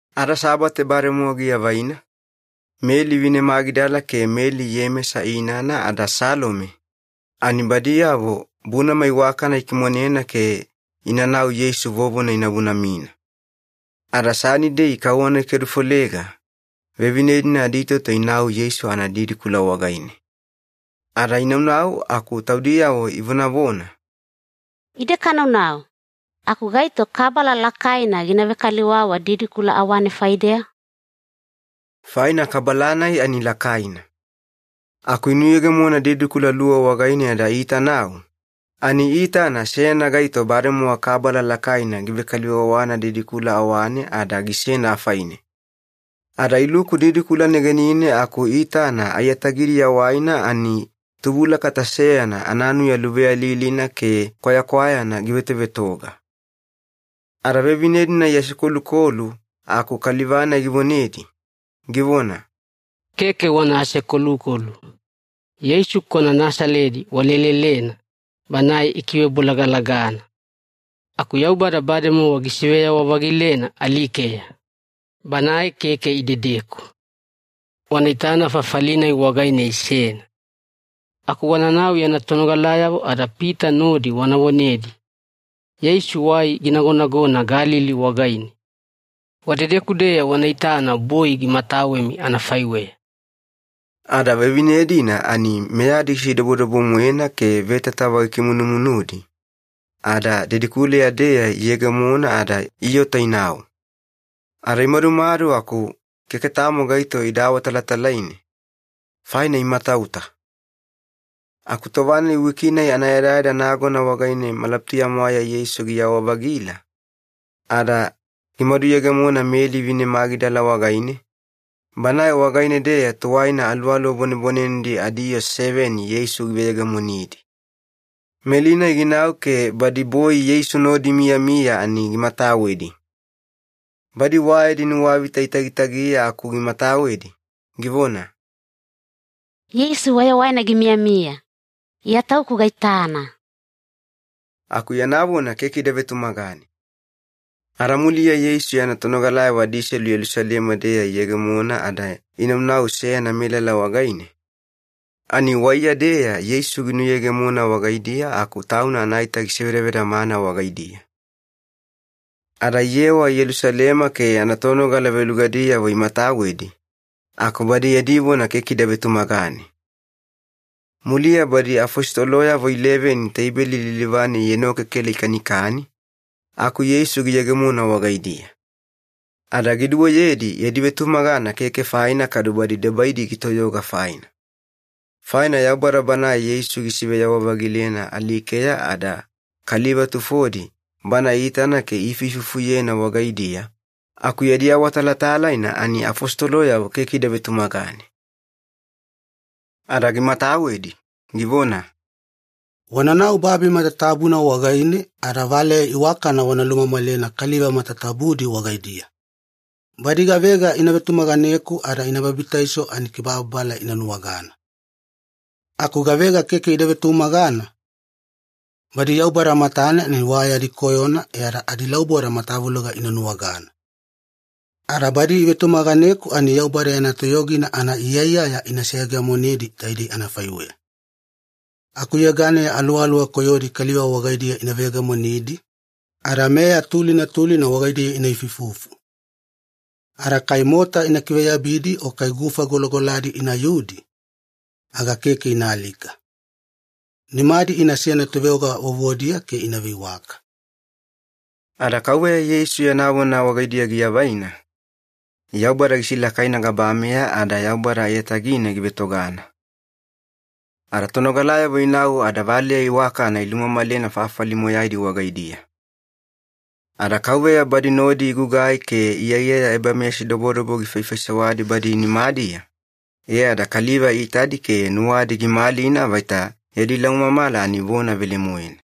Ada Sabate bademowa giavaina, Meli vine Magidala ke Meli Iyemesa inana ada Salome, ani badiyavo bunama iwakana ikimonena ke inanau Yeisu vovona ina bunamina. Ada Sanidei kauwana gikedufolega vevine-dina aditoto inau Yeisu anadidikula wagaine. Ada inaunau aku taudiyavo ivonavona, “Ide kanaunau, aku gaito kabala lakaina gina vekaliwawa didikula awane faideya?” Faina kabala-nai ani lakaina. Aku inuyegemona didikula luwa wagaine ada iitanau, ani iitana seyana gaito bademowa kabala lakaina givekaliwawana didikula awane ada gisena afaine. Ada iluku didikula negenine aku iitana aiyatagidiya waina ani tubulakata seyana ananuya luveyalilina ke kwayakwayana givetovetoga. Ada vevine-dina iasekolukolu aku kaliva-nai givonedi, givona, “Keke wana asekolukolu. Yeisu kwana Nasaledi walelelena, Banae ikivebolagalagana. Aku Yaubada bademowa gisiveyawa-vagilena alikeya! Banae keke idedeku. Wana itana fafali-nai wagaine isena. Aku wananau yana tonogalayavo ada Pita nodi wana vonedi, ‘Yeisu wai ginagonagona Galili wagaine. Wadedeku-deya wana itana boi gimatawemi anafaiweya.’” Ada vevine-dina ani meyadi gisidobodobo-moena ke vetatava gikimunumunudi, ada didikuleya-deya iyegemona ada iota inau. Ada imadumadu aku keke tamo gaito ida awatalatalaine, faina imatauta. Aku tova-nai wiki-nai anayadayada nagona wagaine malabutuya-mwaeya Yeisu giyawa-vagila, ada gimaduyegemona Meli vine Magidala wagaine, banae wagaine-deya tuwaina aluwaluwa bwanebwanenedi adiyoo seveni Yeisu giveyegemonidi. Meli-nai ginau ke badi boi Yeisu nodi imiyamiya ani gimatawedi. Badi wa yadi nuwavita itagitagiya aku gimatawedi, givona, “Yeisu wayawaina gimiyamiya! Iya tauku gaitana!” Aku yana vona keke ida vetumagane. Ada muliya Yeisu yana tonogalayavo adiselu Yelusalema-deya iyegemona ada inaunau seyana melala wagaine, ani waiya-deya Yeisu giyegemona wagaidiya aku Tauna anaita gisevedavedamana wagaidiya. Ada iyewa Yelusalema ke yana tonogala velugadiyavo imatawedi, aku badi yadi vona keke ida vetumagane. Muliya badi afositoloyavo ileveni teibeli lilivane ienokekela ikanikani, aku Yeisu giyegemona wagaidiya. Ada giduweyedi yadi vetumagana keke faina kadu badi debaidi gitoyoga faina. Faina Yaubada Banae Yeisu gisiveyawa-vagilena alikeya ada kaliva tufodi Bana iitana ke iifuifufuyena wagaidiya, aku yadi awatalatalaina ani afositoloyavo keke ida vetumagane. Ada gimatawedi, givona, “Wananau babi matatabuna wagaine ada valeya iwakana wana lumamalena kaliva matatabudi wagaidiya. Badi gavega ina vetumaganeku ada ina babitaiso ani kibababala ina nuwagana. Aku gavega keke ida vetumagana, badi Yaubada matane ani wa yadi koyona e ada adilauboda matavuloga ina nuwagana. Ada badi ivetumaganeku ani Yaubada yana toyogina anaiyaiyaya ina seyegemonedi taidei anafaiweya. Akuyeganeya aluwaluwa koyodi kaliva wagaidiya ina veyegemonidi, ada meya tulina tulina wagaidiya ina ifuifufu. Ada kai mota ina kiveyabidi o kai gufa golagoladi inayudi, aga keke ina alika. Nimadi inasena toveoga vovodiya ke ina veiwaka.” Ada Kauveya Yeisu yana vona wagaidiya giavaina, Yaubada gisilakaina gabameya ada Yaubada aiyatagine givetogana. Ada tonogalayavo inau ada valeya iwakana ilumamalena fafali moyaidi wagaidiya. Ada Kauveya badi nodi igugai ke iyaiyaya ebameyasidobodobo gifaifaisewadi badi nimadiya, e ada kaliva iitadi ke nuwadi gimalina vaita yadi laumamala ani vona velemoena.